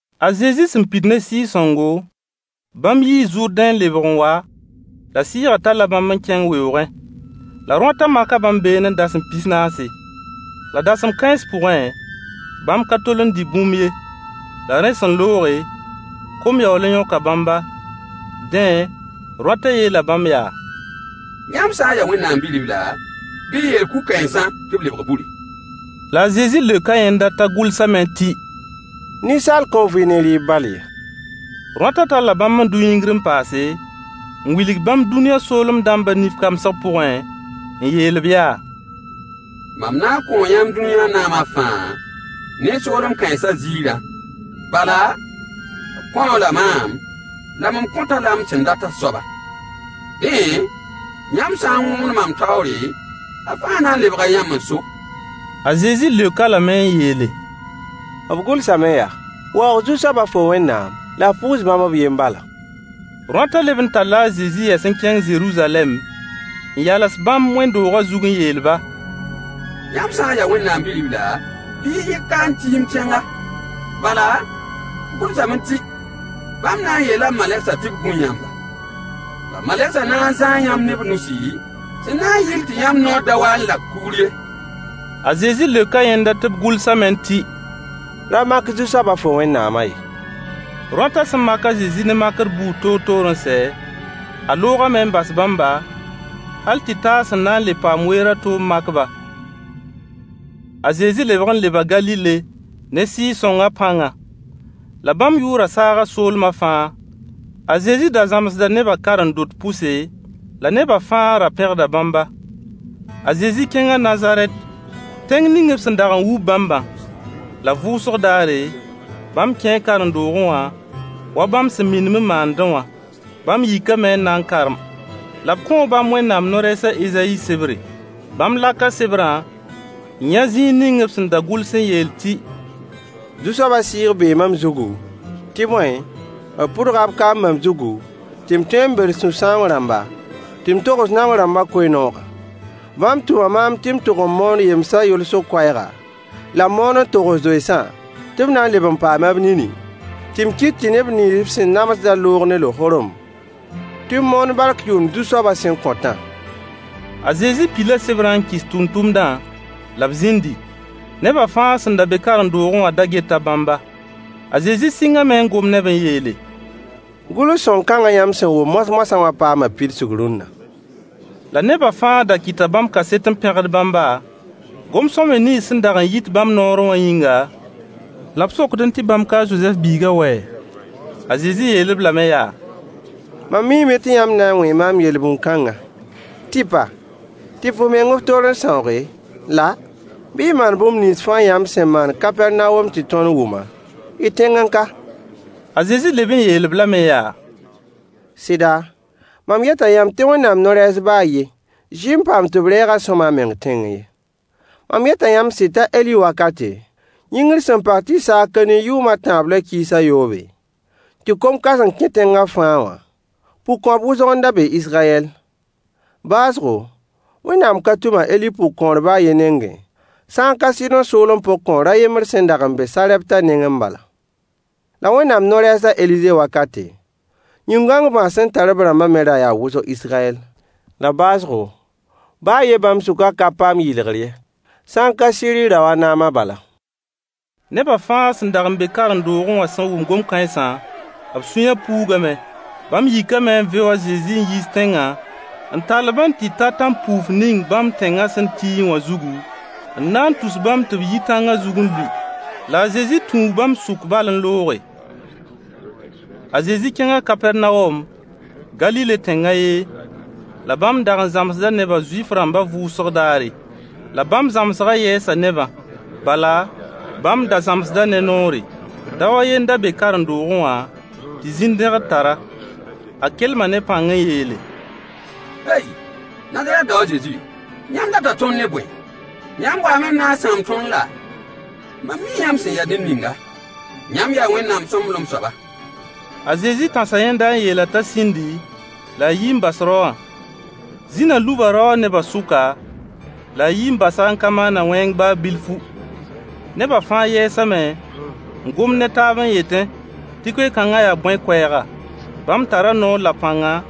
A Zezi sẽn pid ne Sɩɩg-sõngo, bãmb yii Zʋrdẽ n lebg n wa, la Sɩɩgã talla bãmb n kẽng weoogẽ. La rõatã maka bãmb beene dasem pis-naase. La dasem kãens pʋgẽ, bãmb ka tol n dɩ bũmb ye. La rẽ sẽn looge, kom yaool n yõka bãmba. Dẽ, rõata yeela bãmb yaa: Yãmb sã n yaa Wẽnnaam Bi-ribla, bɩ y yeel kug-kãensã tɩ b lebg buri. La a Zezi leoka yẽnda t'a gʋlsame tɩ: Ninsaal kõn vɩ ne rɩɩb bal ye. Rõata talla bãmb n dʋ yĩngr n paase, n wilg bãmb dũniyã soolem dãmbã nif kamsg pʋgẽ, n yeel-b yaa: Mam na n kõo yãmb dũni naamã fãa, ne soolem kãensã ziirã, bala, b kõ-a-la maam, la mam kõt-a la m sẽn dat a soaba. Dẽ, yãmb sã n wõgemd mam taoore, a fãa na n lebga yãmb n so. A Zezi leok-a lame n yeele: B gʋlsame yaa: “Waoog Zu-soaba, fo Wẽnnaam, la f pʋʋs bãmb b yen bala.” Rõata leb n talla a Zezi yɛs n kẽng Zeruzalɛm, n yals bãmb wẽnd-doogã zug n yeel-ba: Yãmb sã n yaa Wẽnnaam Bi-ribla, bɩ y yɩk ka n tiimd tẽnga. Bala, b gʋlsame tɩ: “Bãmb na n yeela b malegsã tɩ b gũ yãmba, la malegsã na n zãa yãmb ne b nusi, sẽn na n yɩl tɩ yãmb naoor da wa n lak kugr ye.” A Zezi leoka yẽnda tɩ b gʋlsame tɩ: Ra mak Zu-soaba, fo Wẽnnaamã ye. Rõata sẽn mak a Zezi ne makr buud toor-toor n sɛ, a loogame n bas bãmba, hal tɩ ta a sẽn na n le paam weer a to n mak-ba. A Zezi lebg n leba Galile ne Sɩɩg-sõngã pãnga. La bãmb yʋʋrã saaga soolmã fãa. A Zezi da zãmsda nebã karen-dot pʋse, la nebã fãa ra pẽgda bãmba. A Zezi kẽnga Nazarɛt, tẽng ning b sẽn dag n wub bãmbã. La vʋʋsg daare, bãmb kẽe karen-doogẽ wã wa bãmb sẽn minim n maandẽ wã. Bãmb yikame n na n karem. La b kõo bãmb Wẽnnaam no-rɛɛs a Ezayi sebre. Bãmb laka sebrã, n yã zĩig ning b sẽn da gʋls n yeel tɩ: Zu-soabã Sɩɩg bee mam zugu, tɩ bõe, b pʋdga b kaam mam zugu, tɩ m tõe n bels sũ-sãoong rãmba, tɩ m togs naong rãmbã koe-noogã. Bãmb tʋma maam tɩ m tʋg n moon yemsã yolsg koɛɛga, la m moon n togs zoensã, tɩ b na n leb n paama b nini, tɩ m kɩt tɩ neb nins b sẽn namsdã loog ne lohorem, tɩ m moon bark yʋʋmd Zu-soabã sẽn kõtã. A Zezi pila sebrã n kɩs tʋmtʋmdã la b zĩndi. Neba fãa sẽn be karen-doogẽ wã da geta bãmba. A Zezi sɩngame n gom ne-b n yeele: Gʋls-sõng kãngã yãmb sẽn wʋm moas-moasã wã paama pidsg rũnna. La nebã fãa da kɩta bãmb kaset n pẽgd bãmba, gom-sõamy nins sẽn dag n yit bãmb noorẽ wã yĩnga, la b sokdẽ tɩ bãmb ka a Zozɛf biigã wɛ? A Zezi yeel-b lame yaa: Mam miime tɩ yãmb na n wẽe maam yel-bũn kãnga: Tɩpa, tɩp f meng f toor n sãooge, la: bɩ y maan bũmb nins fãa yãmb sẽn maan Kapɛrnawom tɩ tõnd wʋmã, y tẽngẽ ka. A Zezi leb n yeel-b lame yaa: Sɩda, mam yeta yãmb tɩ Wẽnnaam no-rɛɛs baa a yen zɩ n paam tɩ b reeg-a sõama a meng tẽngẽ ye. Mam yeta yãmb sɩd t'a Eli wakate, yĩngr sẽn pag tɩ saag ka ni yʋʋm a tãab la kiis a yoobe, tɩ kom kãseng kẽ tẽngã fãa wã, pʋgkõap wʋsg n da be Israyɛl. Baoosgo, Wẽnnaam ka tʋm a Eli pʋgkõor baa a yen nengẽ, sã n ka Sɩdõ soolem pʋgkõor a yembr sẽn dag n be Sarɛpta nengẽ bala. La Wẽnnaam no-rɛɛs a Elize wakate, yĩn-gãong bãas sẽn tar b rãmbã me ra yaa wʋsg Israyɛl. La baoosgo, baa a yen bãmb sʋkã ka paam yɩlgr ye, sã n ka Siiri rao a Naama bala. Neba fãa sẽn dag n be karen-doogẽ wã sẽn wʋm gom kãensã, b sũyã puugame. Bãmb yikame n veo a Zezi n yiis tẽngã, n tall-b n tɩ ta tãn-puuf ning bãmb tẽngã sẽn tiẽ wã zugu, n na n tus bãmb tɩ b yi tãngã zug n lʋɩ. La a Zezi tũu bãmb sʋk bal n looge. A Zezi kẽnga Kapɛrnawom, Galile tẽng a ye, la bãmb dag n zãmsda nebã Zuif-rãmbã vʋʋsg raare. La bãmb zãmsgã yɛɛsa nebã. Bala, bãmb da zãmsda ne noore. Dao a yen n da be karen-doogẽ wã tɩ zĩn-dẽgd tar-a. A kelma ne pãng n yeele: Hey! Nazarɛt dao a Zezi, yãmb data tõnd ne bõe? Yãmb waame n na n sãam tõnd laa? Mam mii yãmb sẽn ya ned ninga. Yãmb yaa Wẽnnaam sõmblem soaba. A Zezi tãsa yẽnda n yeel-a t'a sĩndi, la a yi n bas rao wã. Zĩnã luba daowã nebã sʋka, la a yi n bas-a n ka maan-a wẽng baa bilfu. Nebã fãa yɛɛsame n gomd ne taab n yetẽ tɩ koe-kãngã yaa bõe koɛɛga? Bãmb tara noor la pãnga,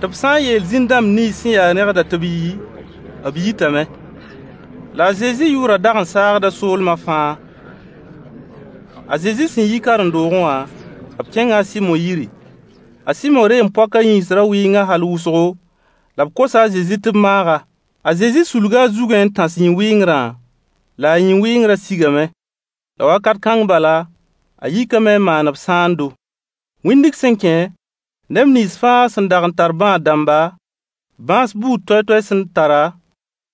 tɩ b sã n yeel zĩn-dãmb nins sẽn ya rẽgdã tɩ b yi, b yitame. La a Zezi yʋʋrã dag n saagda soolmã fãa. A Zezi sẽn yi karen-doogẽ wã, b kẽnga a Sɩmo yiri. A Sɩmo reem-poakã yĩns ra wɩnga hal wʋsgo, la b kosa a Zezi tɩ b maag-a. A Zezi sulga a zugẽ n tãs yĩn-wɩngrã, la a yĩn-wɩngrã sigame. La wakat kãng bala, a yikame n maan-b sãando. Wĩndg sẽn kẽ, neb nins fãa sẽn dag n tar bãad-dãmba, bãas buud toay-toay sẽn tara,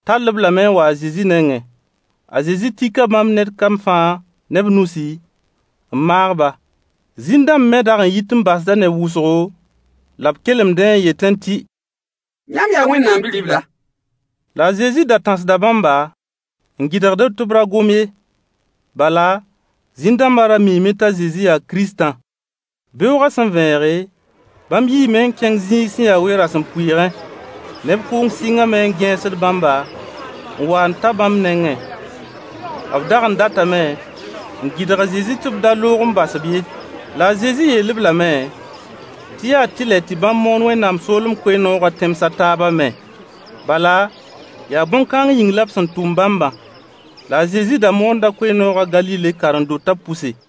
tall-b lame n wa a Zezi nengẽ. A Zezi tika bãmb ned kam fãa ne b nusi, n maag-ba. Zĩn-dãmb me dag n yit n basda neb wʋsgo, la b kelemdẽ n yetẽ tɩ: Yãmb yaa Wẽnnaam Bi-ribla. La a Zezi da tãsda bãmba, n gɩdgd-b tɩ b ra gom ye. Bala, zĩn-dãmbã ra miime t'a Zezi yaa Kiristã. Beoogã sẽn vẽege, bãmb yiime n kẽng zĩig sẽn ya we-rasempʋɩɩgẽ. Neb kʋʋng sɩngame n gẽesd bãmba, n wa n ta bãmb nengẽ. B dag n datame n gɩdg a Zezi tɩ b da loog n bas-b ye. La a Zezi yeel-b lame tɩ yaa tɩlɛ tɩ bãmb moon Wẽnnaam soolem koe-noogã tẽms a taabã me. Bala, yaa bõn-kãng yĩng la b sẽn tʋm bãmbã. La a Zezi da moonda koe-noogã Galile karen-dotã pʋse.